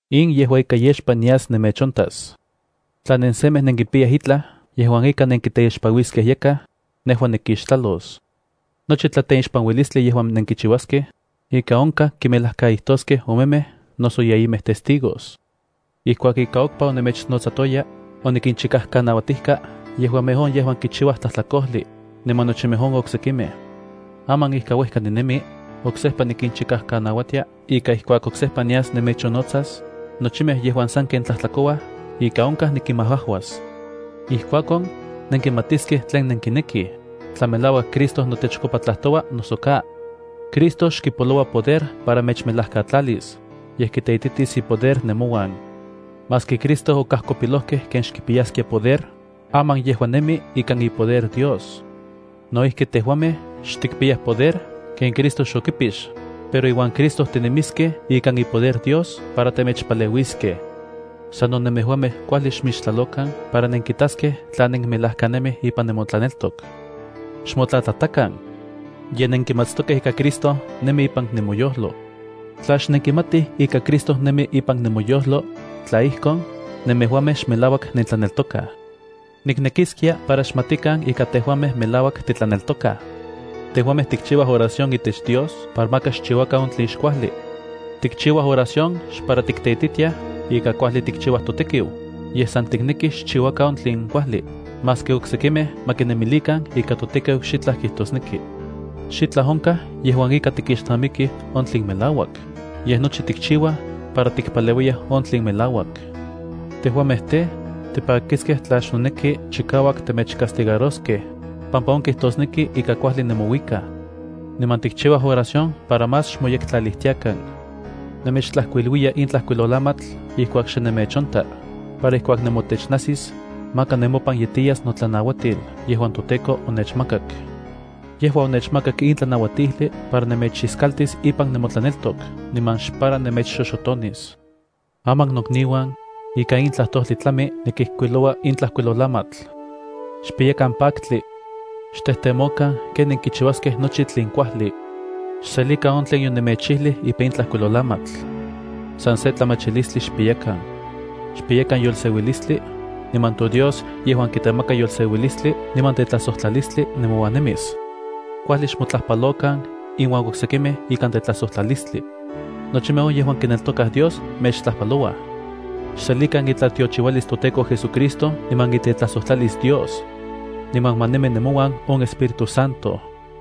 In yejua ika yexpa nias nemechontas. Tla nensemej nenkipiyaj itlaj yejuan ika nenkiteixpanuiskej yakaj, nejua nikixtlalos. Nochi tlateixpanuilistli yejuan nenkichiuaskej, ika onkaj kimelajkaijtoskej omemej noso yeyimej testigos. Ijkuak ika okpa onemechnotsatoya, onikinchikajkanauatijka yejuamej on yejuan kichiuayaj tlajtlakojli, niman nochimej on oksekimej. Aman ika uejka ninemi, oksejpa nikinchikajkanauatia ika ijkuak oksejpa nias nemechonnotsas, nochimej yejuan sanken tlajtlakouaj ika onkaj nikinmajajuas. Ijkuakon, nenkimatiskej tlen nenkinekij, tla melauak Cristo notechkopa tlajtoua noso ka. Cristo xkipoloua poder para mechmelajkatlalis, yej kiteititis ipoder nemouan. Maski Cristo okajkopilojkej ken xkipiyaskia poder, aman yejua nemi ikan ipoder Dios. No ijki tejuamej xtikpiyaj poder ken Cristo xokipix, pero iuan Cristo tinemiskej ikan ipoder Dios para temechpaleuiskej. Sano nemejuamej kuajli xmixtlalokan para nenkitaskej tla nenmelajkanemij ipan nemotlaneltok. ¡Xmotlatlatakan! Ye nenkimatstokej ika Cristo nemi ipan nemoyojlo. Tla xnenkimatij ika Cristo nemi ipan nemoyojlo, tla ijkon, nemejuamej xmelauak nentlaneltokaj. Niknekiskia para xmatikan ika tejuamej melauak titlaneltokaj. Tejuamej tikchiuaj oración itech Dios para maka xchiuakan on tlen xkuajli. Tikchiuaj oración xpara tikteititiaj ika kuajli tikchiuaj totekiu, yej san tiknekij xchiuakan on tlen kuajli, maski oksekimej ma kinemilikan ika totekiu xitlaj kijtosneki. Xitlaj onkaj yejuan ika tikixnamikij on tlen melauak, yej nochi tikchiuaj para tikpaleuiyaj on tlen melauak. Tejuamej tej, tipakiskej tla xnoneki chikauak temechcastigaroskej, pampa on kijtosneki ika kuajli nemouikaj. Niman tikchiuaj oración para más xmoyektlalijtiakan. Nemechtlajkuiluiya in tlajkuilolamatl ijkuak xe nemechonta, para ijkuak nemotech najsis, maka nemopan yetiyas notlanauatil yejuan toTEKO onechmakak. Yejua onechmakak in tlanauatijli para nemechiskaltis ipan nemotlaneltok niman xpara nemechxoxotonis. Aman nokniuan, ikan in tlajtojli tlami nikijkuiloua in tlajkuilolamatl. Xpiyakan paktli. Xtejtemokan ken nenkichiuaskej nochi tlen kuajli. Xselikan on tlen yonemechijlij ipan in tlajkuilolamatl. San se tlamachilistli xpiyakan. Xpiyakan yolseuilistli, niman toDios yejuan kitemaka yolseuilistli niman tetlajsojtlalistli nemouan nemis. Kuajli xmotlajpalokan inuan oksekimej ikan tetlajsojtlalistlia. Nochimej on yejuan kineltokaj Dios mechtlajpalouaj. Xselikan itlatiochiualis toTEKO JesuCristo niman itetlajsojtlalis Dios. Niman ma nemi nemouan on Espíritu Santo.